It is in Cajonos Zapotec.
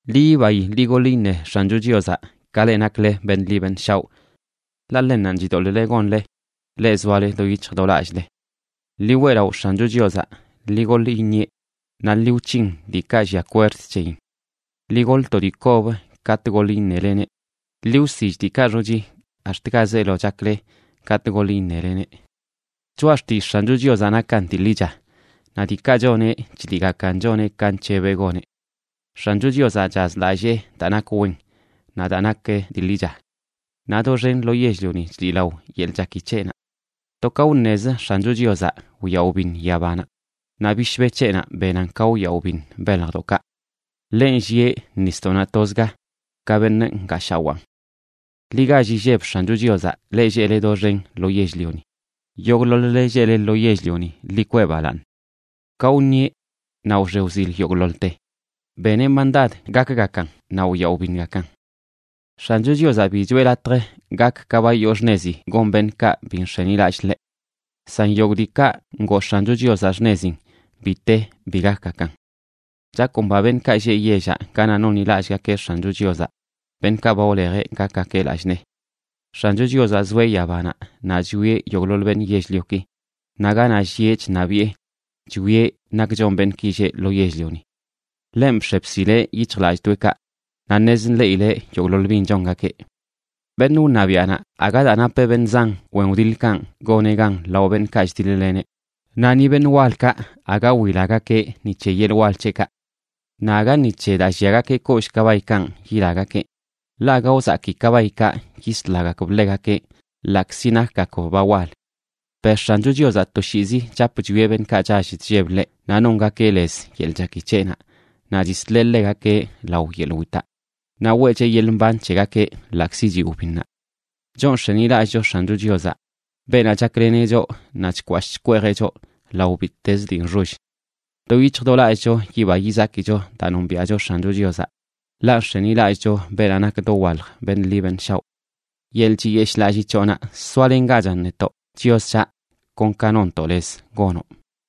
Ḻi yibayi, ḻi goḻ iṉe X̱ancho Chiozaꞌ, ka leꞌ nakle beṉꞌ ḻi beṉꞌ shaoꞌ, ḻaꞌ ḻennanꞌ chidoḻꞌle gonle, leꞌ zoale do yic̱hj do lallꞌle. Ḻi weꞌlaꞌo X̱ancho Chiozaꞌ, ḻi goḻ iṉieꞌ, naꞌ ḻi wc̱hin diikaꞌ llia kwerd c̱heyin. Ḻi goḻ to dii kob katꞌ goḻ iṉeleneꞌ. Ḻi wsill diikaꞌ xochi ax̱t ga zeelo chakle katꞌ goḻ iṉeleneꞌ. Choꞌa xtillꞌ X̱ancho Chiozaꞌ nakan dii ḻicha, naꞌ diikaꞌ choneꞌ chliꞌgakan choneꞌ ka nc̱hebeꞌ goneꞌ. X̱ancho Chiozaꞌ chazlallee daa nak wen naꞌ daa nak dii ḻicha; naꞌ doxen lo yell-lioni chliꞌlao yeḻꞌ chaki c̱heꞌnaꞌ. To ka wṉezə X̱ancho Chiozaꞌ, wyaꞌ wbiṉ yabanaꞌ, naꞌ bishbe c̱heꞌnaꞌ benan ka wyaꞌ wbiṉ beljdoꞌkaꞌ. Ḻeꞌ nllieꞌ nisdoꞌnaꞌ tozga, ka beṉꞌ ngaashawaan. Ḻi gall illeb X̱ancho Chiozaꞌ, leꞌ lleꞌle doxen lo yell-lioni; yogꞌḻoḻ-le lleꞌle lo yell-lioni, ḻi kwee balaaṉ. Ka wṉieꞌ, naꞌ wxe wzil yogꞌḻoḻte. Beneꞌ mandad gakgakan, naꞌ wyaꞌ wbiṉgakan. X̱ancho Chiozaꞌ bi choꞌe latj gak ka ba yoo xṉezi gon beṉꞌkaꞌ bi nx̱enilallꞌ ḻeꞌ. San yogꞌ diikaꞌ ngoo X̱ancho Chiozaꞌ xṉezin, bi te bi gakgakan. Chakomba beṉꞌkaꞌ lleꞌ yellaꞌ ganaꞌ nonḻilallꞌgakeꞌ X̱ancho Chiozaꞌ, beṉꞌkaꞌ ba wlejeꞌ gakgakeꞌ lallꞌ nee. X̱ancho Chiozaꞌ zoeꞌ yabanaꞌ naꞌ chwieꞌ yogꞌḻoḻ beṉꞌ yell-lioki. Naꞌ ganaꞌ llieꞌ chṉabiꞌe chwieꞌ nak chon beṉꞌki lleꞌ lo yell-lioni. Ḻenꞌ bx̱e bsileꞌ yic̱hjlallꞌdoꞌekaꞌ, naꞌ ṉez nḻeꞌileꞌ yogꞌḻoḻ bin chongakeꞌ. Beṉꞌ wṉabiaꞌnaꞌ, aga daa napeꞌ beṉꞌ zan wen wdiḻkanꞌ goneꞌ gan lao beṉꞌkaꞌ chdiḻ-leneꞌ, naꞌ ni beṉꞌ walkaꞌ, aga wilagakeꞌ ni c̱he yeḻꞌ wal c̱heꞌkaꞌ. Naꞌ aga ni c̱he daa lliagakeꞌ kollꞌ kabaykanꞌ yilagakeꞌ, ḻaꞌ aga wzaki kabaykaꞌ yislagakb ḻegakeꞌ ḻaꞌkzi nakgakb ba wal. Per X̱ancho Chiozaꞌ toshiizi chap chwieꞌ beṉꞌkaꞌ chall chlleb ḻeꞌ naꞌ nongakeꞌ lez yeḻꞌ chaki c̱heꞌnaꞌ, naꞌ chisleꞌ ḻegakeꞌ lao yeḻꞌ witaꞌ, naꞌ weꞌcheꞌ yeḻꞌ mban c̱hegakeꞌ ḻaꞌkzi chiꞌ wbinnaꞌ. Choꞌ nx̱enilallꞌcho X̱ancho Chiozaꞌ, beenaꞌ chakleneꞌ choꞌ naꞌ chkwashꞌ chkweejeꞌ choꞌ lao bittez dii nxoll. Do yic̱hj do lallꞌcho yiba yizakicho daa nombiaꞌcho X̱ancho Chiozaꞌ, ḻaꞌ nx̱enilallꞌcho beenaꞌ nak dowalj beṉꞌ ḻi beṉꞌ shaoꞌ. Yeḻꞌ chiyeshꞌlallii c̱hoꞌnaꞌ soalengachan netoꞌ, Chios c̱haꞌ, kon ka nonntoꞌ lez gonoꞌ.